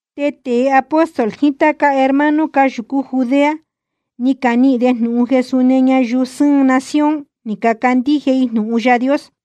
Te tēe apóstol jiín táca hermano cáyūcú Judea, ni canihīn de jnūhun jeē súni ñayuu sɨ́ɨn nación ni cacandíje i jnūhun Yaā Dios.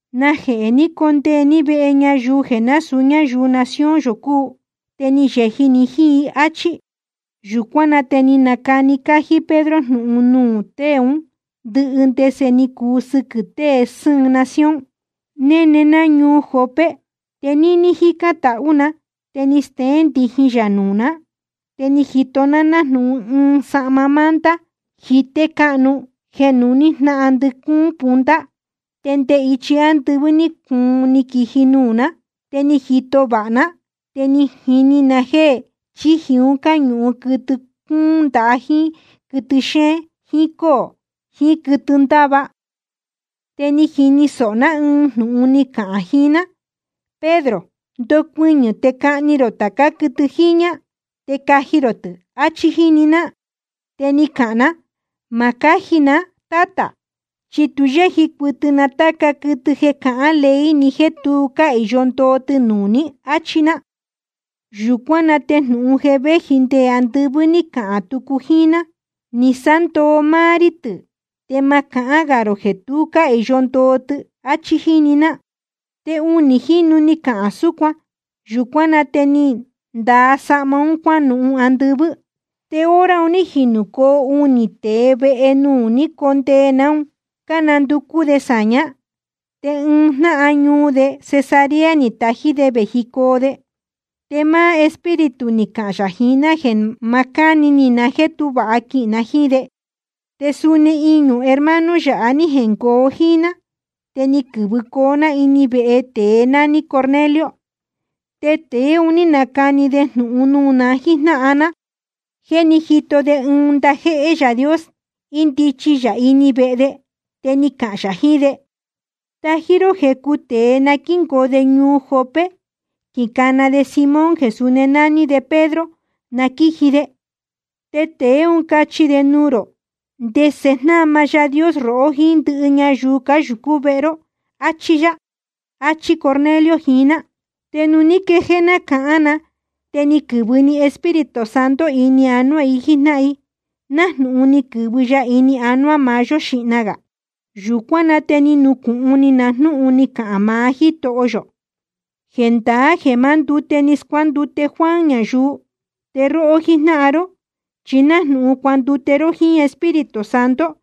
¿Najehē ni condee ní vehe ñayuu jeē násūu ñáyuu nación yō cúu? Te ni yeji ni jíín i, áchí. Yūcuán na te ni nacani cájí Pedro jnūhun nuū tée ún ndɨhɨ ndese ni cuu sɨquɨ̄ tée sɨ́ɨn nación: Néne ná ñuu Jope. Te níní jícán tahú na, te ni steén ndijin yā nuū ná, te ni jito ná nájnūhun ɨɨn sahma manta jité cáhnu jeē nuhní jnáhan ndɨcúún punta, te nde ichi ándɨvɨ́ ní cuun ni quiji nuū ná. Te ni jito vāha ná, te ni jini na jéē chíji un cáñūhun quɨtɨ cúún ndaha jíín quɨtɨ xéén jíín cóō jiín quɨtɨ cándava. Te ni jini sōho ná ɨɨn jnūhun ni cahān jiín ná: Pedro, ndocuɨñɨ̄ te cahni rō tācá quɨtɨ jiñā, te caji rō tɨ̄, áchí jíni ná. Te ni cahān ná: Ma cáji na, Tátā, chi tu yéji cuɨtɨ na táca quɨtɨ jeē cahán ley ni jéē tu cáhīyo ndoo tɨ nuū ní, áchí ná. Yūcuán na te jnūhun jeē véji nde andɨvɨ́ ní cahān tucu jíín ná: Ni sándoo máá rí tɨ̄, te ma cahán gā rō jeē tu cáhīyo ndoo tɨ, áchí jíni ná. Te unī jínu ni cahān súcuan. Yūcuán na te ni ndaa sahma un cuánuhun andɨvɨ́. Te hora un ní jinūcoo unī tēe vehe nuū ni cóndee ná un, cánanducú de sāñá, te ɨɨn jnáhan ñuu de Cesarea ni tají de vējicoo de. Te máá Espíritu ni cahān yā jiín ná jeē ma cáni ni na jéē tú vāha quihīn na jíín de. Te suni iñū hermano yáha ní jengoo jíín ná, te ni quɨ̄vɨcoo ná ini vehe tēe nání Cornelio. Te tēe un ní nacani de jnūhun nuū na jíjnáhan ná jéē ní jito de ɨɨn ndajéhé Yaā Dios, índichi yā ini vehe de, te ni cahān yā jiín de: Tají ró jecu tēe na quíngoo de ñuu Jope, quicana de Simón jeē suni nání de Pedro, na quíji de. Te tēe ún cachi de nuū rō ndese jnama Yaā Dios rohó jíín ndɨhɨ ñayuu cáyūcú vehe ró, áchí yá. Achí Cornelio jiín ná. Te nuū ní quejéé ná cahán na, te ni quɨ̄vɨ‑ni Espíritu Santo ini anuá i jíjnáhan i, nájnūhun ni quɨ̄vɨ ya ini anuá maá yó xīhna gā. Yūcuán na te ni nucūhun ni na jnúhun ni cahān maá Jítoho yō: Jendaá jeē maá ndute‑ni ni scuándute Juan ñayuu. Te róhó jíjnáhan ró chi nájnūhun cuandute ró jíín Espíritu Santo,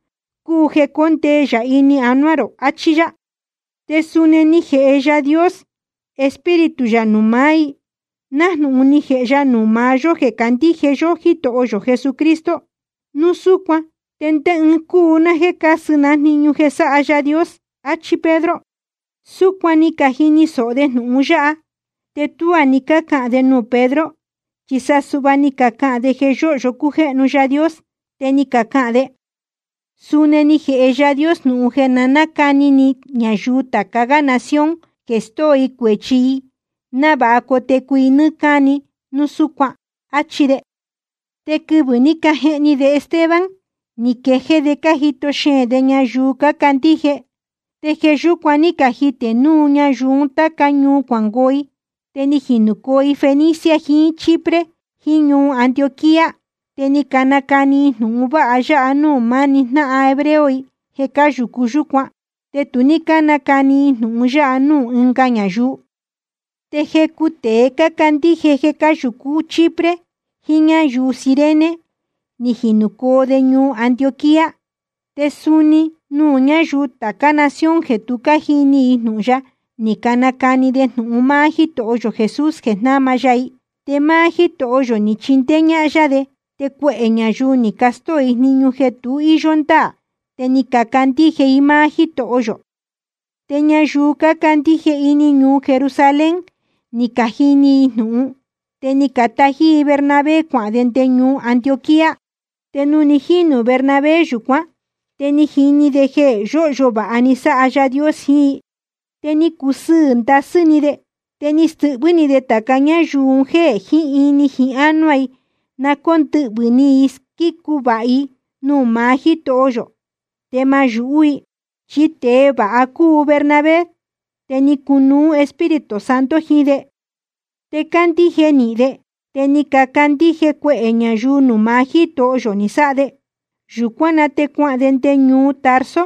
cúu jeē cóndee yā ini anuá rō, achí yá. Te suni ni jēhe Yaā Dios Espíritu yā nuū maá i nájnūhun ni jēhe ya nuū maá yó jeē cácandíje yó Jítoho yō Jesucristo. Núu súcuan ¿te ndé ɨɨn cúu ná jéē cásɨ ná jniñu jeē sáha Yaā Dios? áchí Pedro. Súcuan ni cajini sōho de jnūhun yáha, te tuá ni cácahān de nuū Pedro, chi sa suhva ni cacahān de jeē yóhyo cújéhnu Yaā Dios. Te ni cacahān de: Suni ni jēhe Yaā Dios jnūhun jeē na nácani ni ñayuu tāca gá nación jeē stóo i cuēchi i návāha cotecu i nɨ́ɨ́ cáni núu súcuan, áchí de. Te quɨvɨ̄ ní cajehni de Esteban ni quejéé de cájito xeēn de ñayuu cácandíje, te jeē yúcuan ní cajitē núu ñayuu un táca ñuu cuangoo i, te ni jinūcoo i Fenicia jiín Chipre jiín ñuu Antioquía. Te ni canacani i jnūhun vāha ya nuū máni jnáhan hebreo i jeē cáyūcu yúcuan, te tu ní cánacani i jnūhun ya nuū ɨ́nga ñayuu. Te jecu tēe cácandíje jeē cáyūcu Chipre jiín ñuu Cirene ni jinūcoo de ñuu Antioquía, te suni nuū ñáyuu tācá nación jeē tu cájini i jnūhun ya ni canacani de jnūhun máá Jítoho yō Jesús jeē jnáma ya i. Te máá Jítoho yō ni chindéé ñáhán yá de, te cuehē ñayuu ni castóo i jniñu jeē tu íyó ndáā te ni cacandíje i máá Jítoho yō. Te ñayuu cácandíje ini ñuu Jerusalén ni cajini jnūhun i, te ni catají i Bernabé cuahān de nde ñuu Antioquía. Te nuū ni jínū Bernabé yūcuán, te ni jini de jeē yóhyo vāha ni sáha Yaā Dios jiín i, te ni cusɨɨ̄ ndasɨ́ ni de. Te ni stɨhvɨ́ ni de tāca ñáyuu un jéē jiín ini jiín ánuá i na cóndɨhvɨ̄ ni i squícu vāha i nuū maá Jítoho yō, te ma náyūhú i. Chi tēe vāha cúu Bernabé, te ni cunuú Espíritu Santo jiín de, te cándíje nīhin de. Te ni cacandíje cuehē ñayuu nuū maá Jítoho yō ni sáha de. Yūcuán na te cuahān de nde ñuu Tarso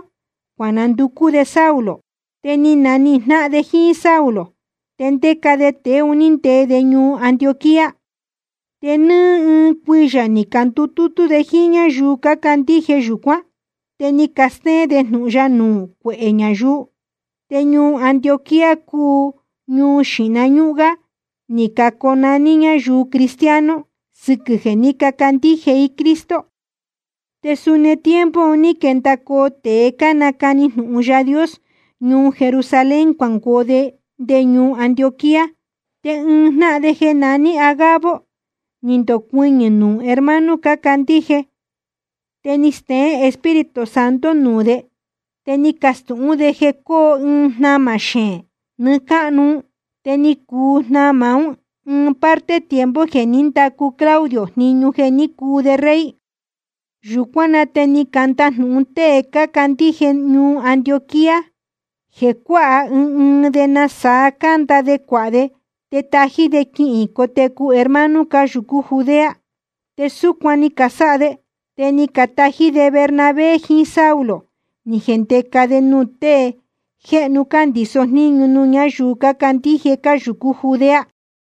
cuananducú de Saulo. Te ni nanihīn jnáhan de jíín Saulo, te ndéca de tēe un ní ndee de ñuu Antioquía. Te nɨ́ɨ́ ɨɨn cuiyā ni candutútú de jíín ñáyuu cácandíje yūcuán, te ni castéén de jnūhun ya nuū cuehē ñayuu. Te ñuu Antioquía cúu nuū xíhna ñúhún gá ni caconaní ñayuu cristiano sɨquɨ̄ jeē ní cacandíje i Cristo. Te suni tiempo un ní quendacoo tēe cánacani jnūhun Yaā Dios ñuu Jerusalén cuangoo de nde ñuu Antioquía. Te ɨɨn jnáhan de jeē naní Agabo ni ndocuɨñɨ̄ nuū hermano cácandíje. Te ni steén Espíritu Santo nuū de, te ni castūhún de jeē cóo ɨɨn jnamā xeēn nɨɨ́ cáhnu. Te ni cuu jnamā ún ɨɨn parte tiempo jeē ní ndacu Claudio jniñu jeē ní cuu de rey. Yūcuán na te ni candajnūhun tée cácandíje ñuu Antioquía jeē cuáha ɨɨn ɨɨn de nasaa canda de cuāha de te tají de quihīn cotecu hermano cáyūcú Judea. Te súcuan ni casáha de. Te ni catají de Bernabé jiín Saulo ni cajendēca de nuū tée jéhnu cándīso jníñu nuū ñáyuu cácandíje cáyūcú Judea.